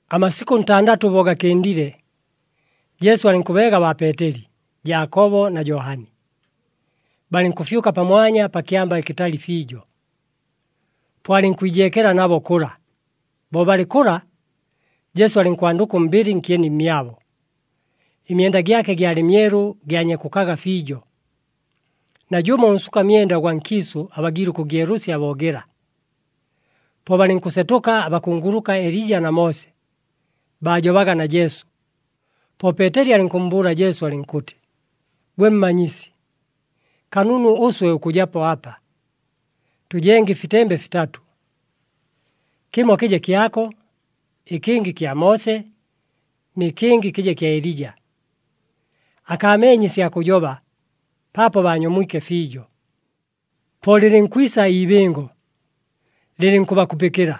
Amasikʉ ntandatʉ bo gakɨndile, Jesu alɨnkʉbeega baa Peeteli, Jaakobo na Johani, balɨnkʉfyʉka pamwanya pa kyamba ɨkɨtali fiijo, po alɨnkwijeekela nabo kʉla. Bo balɨ kʉla, Jesu alɨnkwandʉka ʉmbɨlɨ nkyeni mmyabo, ɨmyenda gyake gyalɨ myelu gyanyekukaga fiijo, najʉmo ʉnsuka myenda ʉgwa nkiisʉ abagiile ʉkʉgyelʉsya bo gɨla. Po balɨnkʉsetʉka abakunguluka Elija na Moose, baajobaga na Jesu. Po Peeteli alɨnkʉmmbʉʉla Jesu, alɨnkʉtɨ, “Gwe Mmanyisi, kanunu ʉswe ʉkʉjapo apa. Tʉjenge ɨfitembe fitatʉ. Kɨmo kɨje kyako, ɨkɨngɨ kya Moose, nɨ kɨngɨ kɨje kya Elija.” Akaameenye ɨsya kʉjoba, paapo baanyomwike fiijo. Po lɨlɨnkwisa iibɨngo, lɨlɨnkʉbakupɨkɨla.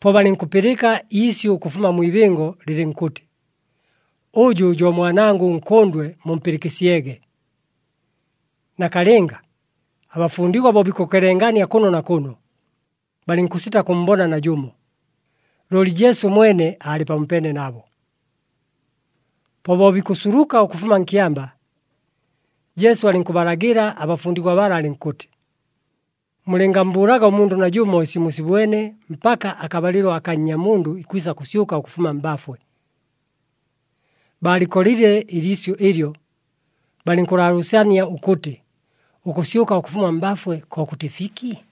Po balɨnkʉpɨlɨka iisyʉ ʉkʉfuma mwi ibɨngo lɨlɨnkʉtɨ, “Ʉjʉ jo Mwanangʉ ʉNkʉndwe, mumpɨlɨkɨsyege!” Nakalɨnga, abafundigwa bo bikʉkelengania kʉno na kʉno, balɨnkʉsita kʉmmbona najʉmo, looli Jesu mwene aalɨ pamopeene nabo. Po bo bikʉsuluka ʉkʉfuma nkyamba, Jesu alɨnkʉbalagɨla abafundigwa bala alɨnkʉtɨ, “Mulɨngammbʉʉlaga ʉmundʉ najʉmo ɨsi musibwene mpaka akabalɨlo aka Nnyamundʉ ikwisa kʉsyʉka ʉkʉfuma mbafwe.” Baalɨkolile ɨliisyʉ ɨlyo, balɨnkʉlaalʉʉsania ʉkʉtɨ ʉkʉsyʉka ʉkʉfuma mbafwe kokʉtɨ fiki?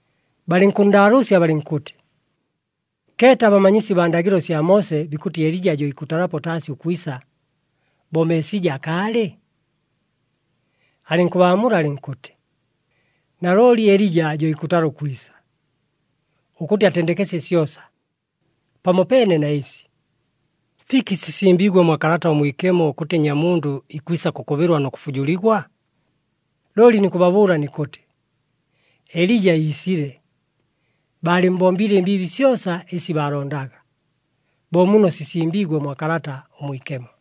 Balɨnkʉnndaalʉʉsya balɨnkʉtɨ, “Keeta, abamanyisi baa ndagɨlo sya Moose bikʉtɨ Elija jo ikʉtalapo taasi ʉkwisa, bo Meesija akaalɨ?” Alɨnkʉbaamula alɨnkʉtɨ, “Nalooli Elija jo ikʉtala ʉkwisa, ʉkʉtɨ atendekesye syosa. Pamopeene na ɨsi, fiki sisimbiigwe mwa Kalata ʉMwikemo ʉkʉtɨ Nnyamundʉ ikwisa kʉkʉbɨlwa nʉ kʉfujuligwa? Looli nikʉbabʉʉla nikʉtɨ, Elija iisile, baalɨmmbombiile ɨmbiibi syosa ɨsi baalondaga, bo muno sisimbiigwe mwa Kalata ʉMwikemo.”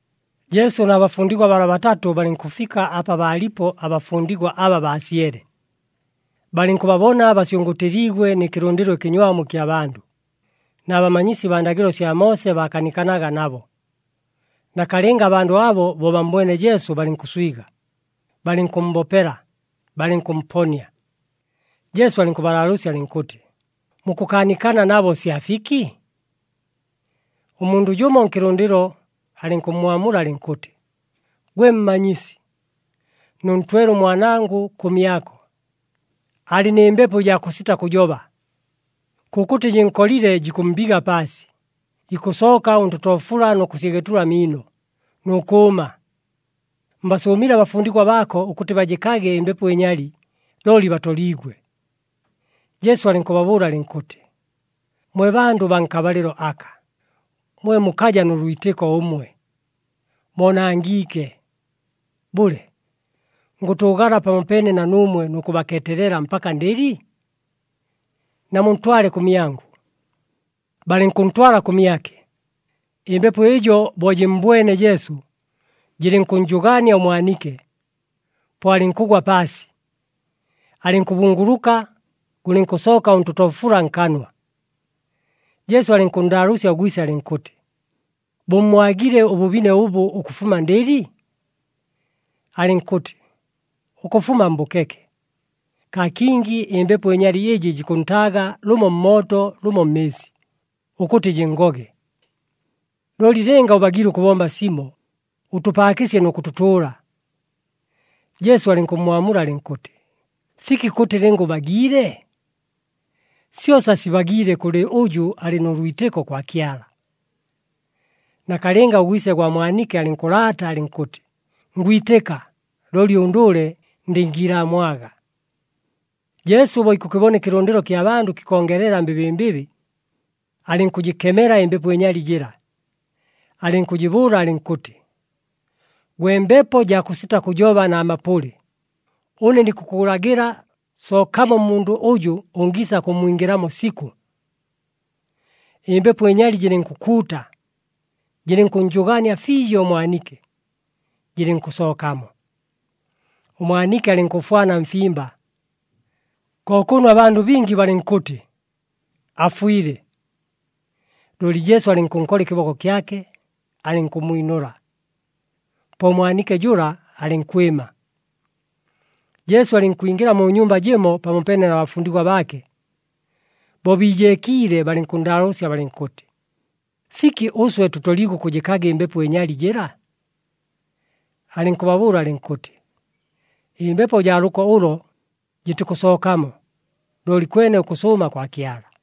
Jesu na bafundigwa bala batatʉ balɨnkʉfika apa baalipo abafundigwa aba baasyele. Balɨnkʉbabona basyʉngʉʉtɨliigwe nɨ kɨlʉndɨlo ɨkɨnywamu ɨkya bandʉ, na bamanyisi baa ndagɨlo sya Moose bakaanikanaga nabo. Nakalɨnga abandʉ abo bo bammbwene Jesu balɨnkʉswiga, balɨnkʉmmbopela, balɨnkʉmponia. Jesu alɨnkʉbalaalʉʉsya alɨnkʉtɨ, “Mukʉkaanikana nabo sya fiki?” Ʉmundʉ jʉmo nkɨlʉndɨlo alɨnkʉmmwamula alɨnkʉtɨ, “Gwe Mmanyisi, nʉntwele ʉmwanangʉ kʉmyako, alɨ nɨ mbepo ɨjaa kʉsita kʉjoba. Kʉkʉtɨ jɨnkolile, jikʉmmbiga paasi, ikʉsooka ʉntotoofula nʉ kʉsyegetula amiino, nʉ kʉʉma. Mbasʉʉmile abafundigwa baako ʉkʉtɨ bajɨkage ɨmbepo ɨnyali, looli batoliigwe.” Jesu alɨnkʉbabʉʉla alɨnkʉtɨ, “Mwe, bandʉ baa nkabalɨlo aka, mwe mukaja nʉ lwitɨko ʉmwe! Moonangiike! Bʉle, ngʉtʉʉgala pamopeene na nuumwe nʉ kʉbakeetelela mpaka ndɨli? Namuntwale kʉmyangʉ.” Balɨnkʉntwala kʉmyake, ɨmbepo ɨjo bo jɨmmbwene Jesu, jɨlɨnkʉnnjʉgaania ʉmwanike, po alɨnkʉgwa paasi, alɨnkʉbunguluka, gʉlɨnkʉsooka ʉntotoofula nkanwa. Jesu alɨnkʉnndaalʉʉsya ʉgwise alɨnkʉtɨ, “Bʉmmwagile ʉbʉbine ʉbʉ ʉkʉfuma ndɨli?” Alɨnkʉtɨ, “Ʉkʉfuma mbʉkeke. Kaa kingi ɨmbepo ɨnyali ɨjɨ jikʉntaaga lʉmo mmooto lʉmo mmɨɨsi, ʉkʉtɨ jɨnngoge. Looli lɨnga ʉbagiile ʉkʉbomba simo, ʉtʉpaakɨsye nʉ kʉtʉtʉʉla.” Jesu alɨnkʉmmwamula alɨnkʉtɨ, “Fiki kʉtɨ, ‘Lɨnga ʉbagiile?’ Syosa sibagiile kʉlɨ ʉjʉ alɨ nʉ lwitɨko kwa Kyala.” Nakalɨnga ʉgwise gwa mwanike alɨnkʉlaata alɨnkʉtɨ, “Ngwitɨka, looli ʉndʉʉle ndɨngiilaamwaga.” Jesu bo ikʉkɨbona ɨkɨlʉndɨlo kya bandʉ kɨkongelela mbɨbɨmbɨbɨ, alɨnkʉjɨkemela ɨmbepo ɨnyali jɨla. Alɨnkʉjɨbʉʉla alɨnkʉtɨ, “Gwe mbepo jaa kʉsita kʉjoba na mapʉlɨ, ʉne nikʉkʉlagɨla, sookamo mmundʉ ʉjʉ ʉngiisa kʉmmwingɨlamo sikʉ!” Ɨmbepo ɨnyali jɨlɨnkʉkuuta, jɨlɨnkʉnnjʉgaania fiijo ʉmwanike, jɨlɨnkʉsookamo. Ʉmwanike alɨnkʉfwana mfimba, ko kʉno abandʉ bingi balɨnkʉtɨ, “Afwile.” Looli Jesu alɨnkʉnkola ɨkɨboko kyake, alɨnkʉmmwinʉla. Po ʉmwanike jʉla alɨnkwɨma. Jesu alɨnkwingɨla mu nyumba jɨmo pamopeene na bafundigwa baake. Bo biijeekiile balɨnkʉnndaalʉʉsya balɨnkʉtɨ, “Fiki ʉswe tʉtoliigwe ʉkʉjɨkaga ɨmbepo ɨnyali jɨla?” Alɨnkʉbabʉʉla alɨnkʉtɨ, “Ɨmbepo jaa lʉko ʉlʉ jɨtikʉsookamo, looli kwene ʉkʉsʉʉma kwa Kyala.”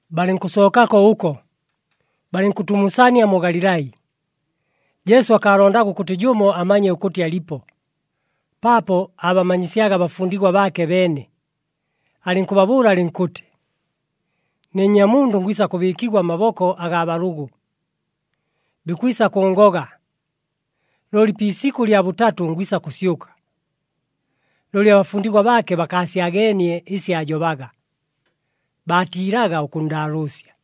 Balɨnkʉsookako ʉko, balɨnkʉtumusania mu Galilai. Jesu akaalondaga ʉkʉtɨ jʉmo amanye ʉkʉtɨ alipo, paapo aabamanyisyaga abafundigwa baake beene, alɨnkʉbabʉʉla alɨnkʉtɨ, “Ne Nnyamundʉ ngwisa kʉbɨɨkigwa mmaboko agaa balʉgʉ. Bikwisa kʉʉngoga, looli pi isikʉ lya bʉtatʉ, ngwisa kʉsyʉka.” Looli abafundigwa baake bakaasyageenie ɨsi aajobaga, baatiilaga ʉkʉnndaalʉʉsya.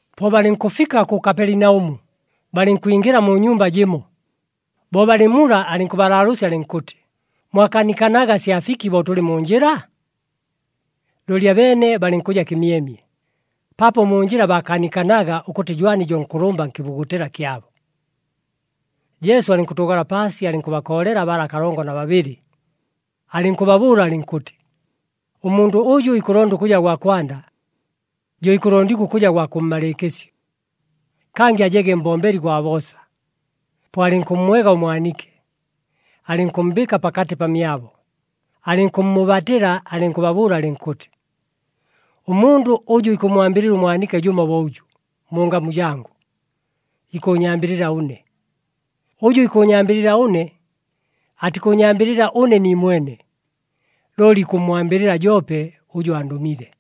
Po balɨnkʉfika kʉ Kapelinaʉmu, balɨnkwingɨla mu nyumba jɨmo. Bo balɨ mula, alɨnkʉbalaalʉʉsya alɨnkʉtɨ, “Mwakaanikanaga sya fiki bo tʉlɨ mu njɨla?” Looli abeene balɨnkʉja kɨmyemye, paapo mu njɨla baakaanikanaga, ʉkʉtɨ jwani jo nkʉlʉmba nkɨbugutɨla kyabo. Jesu alɨnkʉtʉʉgala paasi, alɨnkʉbakoolela bala kalongo na babɨlɨ, alɨnkʉbabʉʉla alɨnkʉtɨ, “Ʉmundʉ ʉjʉ ikʉlonda ʉkʉja gwa kwanda, jo ikʉlondigwa ʉkʉja gwa kʉmmalɨɨkɨsyo, kangɨ ajege mbombeli gwa boosa.” Po alɨnkʉmmwega ʉmwanike, alɨnkʉmmbɨɨka pakatɨ pamyabo, alɨnkʉmmʉʉbatɨla alɨnkʉbabʉʉla alɨnkʉtɨ, “Ʉmundʉ ʉjʉ ikʉmmwambɨlɨla ʉmwanike jʉmo bo ʉjʉ, mu ngamu jangʉ, ikʉʉnyambɨlɨla ʉne. Ʉjʉ ikʉʉnyambɨlɨla ʉne, atikʉʉnyambɨlɨla ʉne niimwene, looli ikʉmmwambɨlɨla joope ʉjʉ andʉmile.”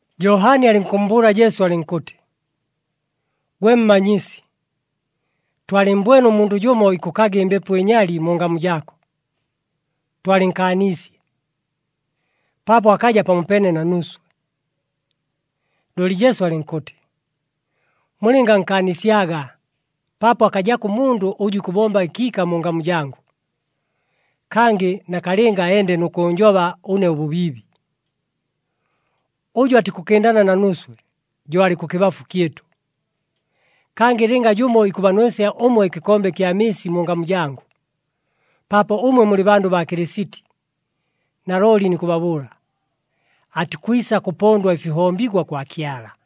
Johani alɨnkʉmmbʉʉla Jesu, alɨnkʉtɨ, “Gwe Mmanyisi, twalɨmmbwene ʉmundʉ jʉmo ikʉkaga ɨmbepo ɨnyali mu ngamu jaako. Twalɨnkaaniisye, paapo akaja pamopeene na nuuswe.” Looli Jesu alɨnkʉtɨ, “Mulɨngankaanisyaga, paapo akajako ʉmundʉ ʉjʉ ikʉbomba ɨkiika mu ngamu jangʉ, kangɨ nakalɨnga ende nʉ kʉʉnjoba ʉne ʉbʉbiibi. Ʉjʉ atikʉkɨndana na nuuswe, jo alɨ kʉkɨbafu kyɨtʉ. Kangɨ lɨnga jʉmo ikʉbanwesya ʉmwe ɨkɨkombe kya mɨɨsi mu ngamu jangʉ, paapo ʉmwe mulɨ bandʉ baa Kɨlɨsiti, nalooli nikʉbabʉʉla, atikwisa kʉpondwa ɨfihombigwa kwa Kyala.”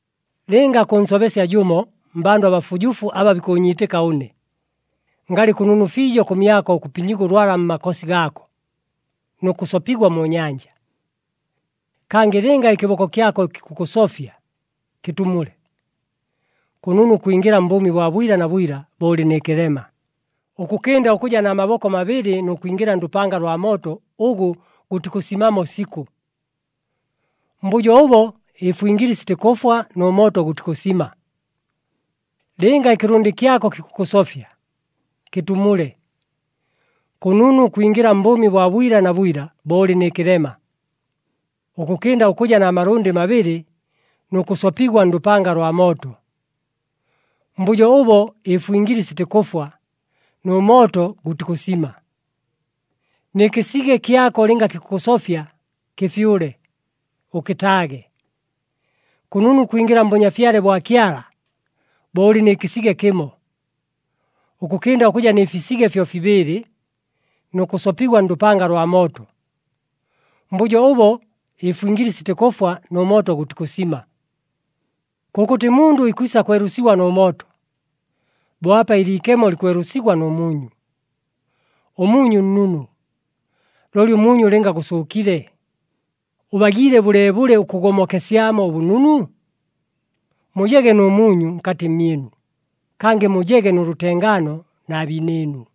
“Lɨnga kʉnsobesya jʉmo mmbandʉ abafujufu aba bikʉʉnyiitɨka ʉne, ngalɨ kʉnunu fiijo kʉmyako ʉkʉpinyigwa ʉlwala mmakosi gaako, nʉ kʉsopigwa mu nyanja. Kangɨ lɨnga ɨkɨboko kyako kikʉkʉsofya, kɨtumule! Kʉnunu ʉkwingɨla mbʉʉmi bwa bwila na bwila, bo ʉlɨ nɨ kɨlema, ʉkʉkɨnda ʉkʉja na maboko mabɨlɨ nʉ kwingɨla ndʉpanga lwa mooto ʉgʉ gʉtikʉsimamo sikʉ. [ Mbʉjo ʉbo ɨfwingili sitikʉfwa nʉ mooto gʉtikʉsima.] Lɨnga ɨkɨlʉndɨ kyako kikʉkʉsofya, kɨtumule! Kʉnunu ʉkwingɨla mbʉʉmi bwa bwila na bwila, bo ʉlɨ nɨ kɨlema, ʉkʉkɨnda ʉkʉja na malʉndɨ mabɨlɨ nʉ kʉsopigwa ndʉpanga lwa mooto. [ Mbʉjo ʉbo ɨfwingili sitikʉfwa nʉ mooto gʉtikʉsima.] Nɨ kɨsige kyako lɨnga kikʉkʉsofya, kɨfyʉle, ʉkɨtaage. Kʉnunu ʉkwingɨla mBʉnyafyale bwa Kyala, bo ʉlɨ nɨ kɨsige kɨmo, ʉkʉkɨnda ʉkʉja nɨ fisige fyofibɨɨlɨ nʉ kʉsopigwa ndʉpanga lwa mooto, mbʉjo ʉbo ɨfwingili sitikʉfwa nʉ mooto gʉtikʉsima. “Kʉkʉtɨ mundʉ ikwisa kwelʉsigwa nʉ mooto, bo apa ɨliikemo likwelʉsigwa nʉ muunyu. Ʉmuunyu nnunu, looli ʉmuunyu lɨnga gʉsʉʉkile, ʉbagiile bʉleebʉle ʉkʉgomokesyamo ʉbʉnunu? Mujege nʉ muunyu nkatɨ mmyɨnu, kangɨ mujege nʉ lʉtengaano na biinɨɨnu.”